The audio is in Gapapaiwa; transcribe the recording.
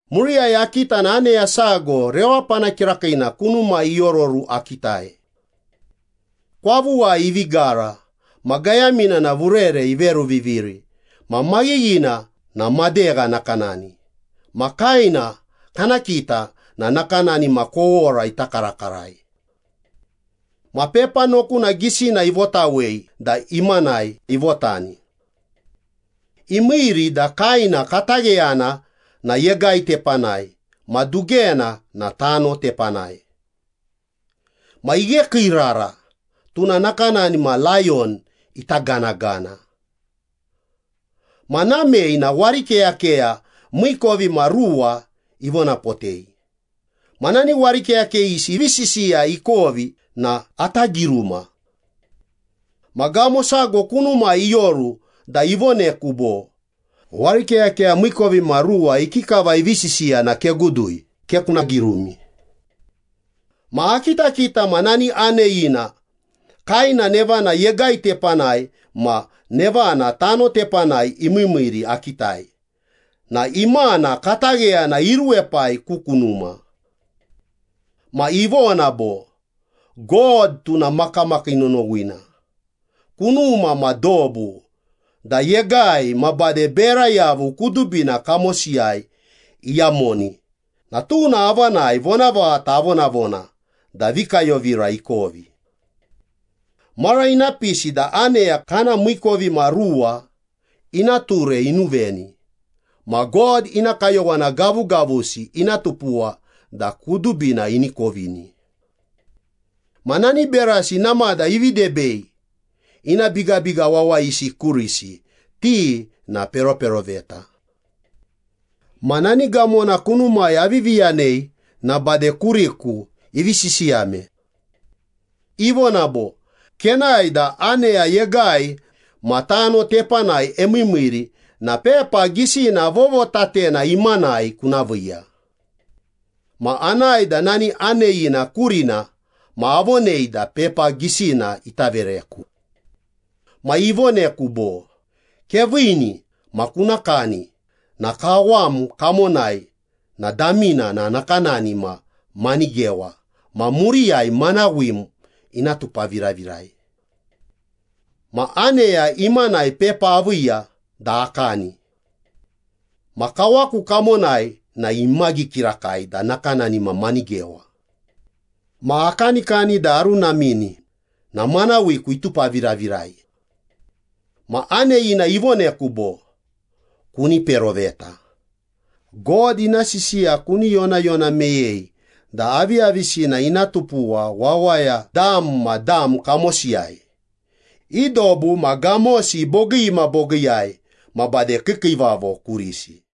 Muriyai akita na aneya sago rewapana kirakiina kunumai iororu akitai. Kwavuwai ivi gara ma gayamina na vurere iveruviviri ma maghighina na madegha nakanani ma kaena kana kita na nakanani ma kowora ita karakarai. Ma pepa nokuna gisina ivotawei da imanai ivotani. Imiiri da kaena katagheyana na yegai tepanai ma dugena na tano tepanai. Ma ighekiirara, tuna nakanani ma layon ita ganagana. Ma namei na warikeyakeya miikovimaruwa ivonapotei. Ma nani warikeyakeyisi ivi sisiya ikovi na ata giruma. Ma gamo sago kunumai ioru da ivoneku bo, “Warikeyakeya miikovimaruwa ikikava ivi sisiya na kegudui, ke kuna girumi.” Ma akitakita na nani aneyina kaena nevana yegai tepanai ma nevana tano tepanai imiimiiri akitai na imana katagheyana iruwepai ku kunuma. Ma ivona bo, “God tuna makamakii nonowina, kunuma ma dobu da yegai ma bade bera yavu kudubina kamosiyai iyamoni na tuna avanai vonavaghata avonavona da vikayovira ikovi. Mara ina pisi da aneya kana miikovimaruwa ina ture inuveni ma God ina kayowana gavugavusi ina tupuwa da kudubina ini kovini. Ma nani berasi namada ivi debei ina bigabiga wawayisi kurisi, ti na peroperoveta.” Ma nani gamona kunumai avivi yanei na bade kuriku ivi sisiyame. Ivona bo, “Kenae da aneya yegai ma tano tepanai emiimiiri na pepa gisina vovotatena imanai kuna viiya.” Ma anae da nani aneyina kurina ma avonei da pepa gisina ita vereku. Ma ivoneku bo, “Keviini ma kuna kani na kawam kamonai na damina na nakanani ma manigewa ma muriyai manawim ina tupaviravirai.” Ma aneya imanai pepa aviiya da akani. Ma kawaku kamonai na imagi kirakai da nakanani ma manigewa. Ma akanikani da arunamini na manawiku itupaviravirai. Ma aneya ivoneku bo, “Kuni peroveta, God ina sisiya kuni yonayona meyei da aviyavisina ina tupuwa wawaya dam ma dam kamosiyai, i dobu ma gamosi bogii ma bogiiyai ma bade kiikiivavo kurisi.”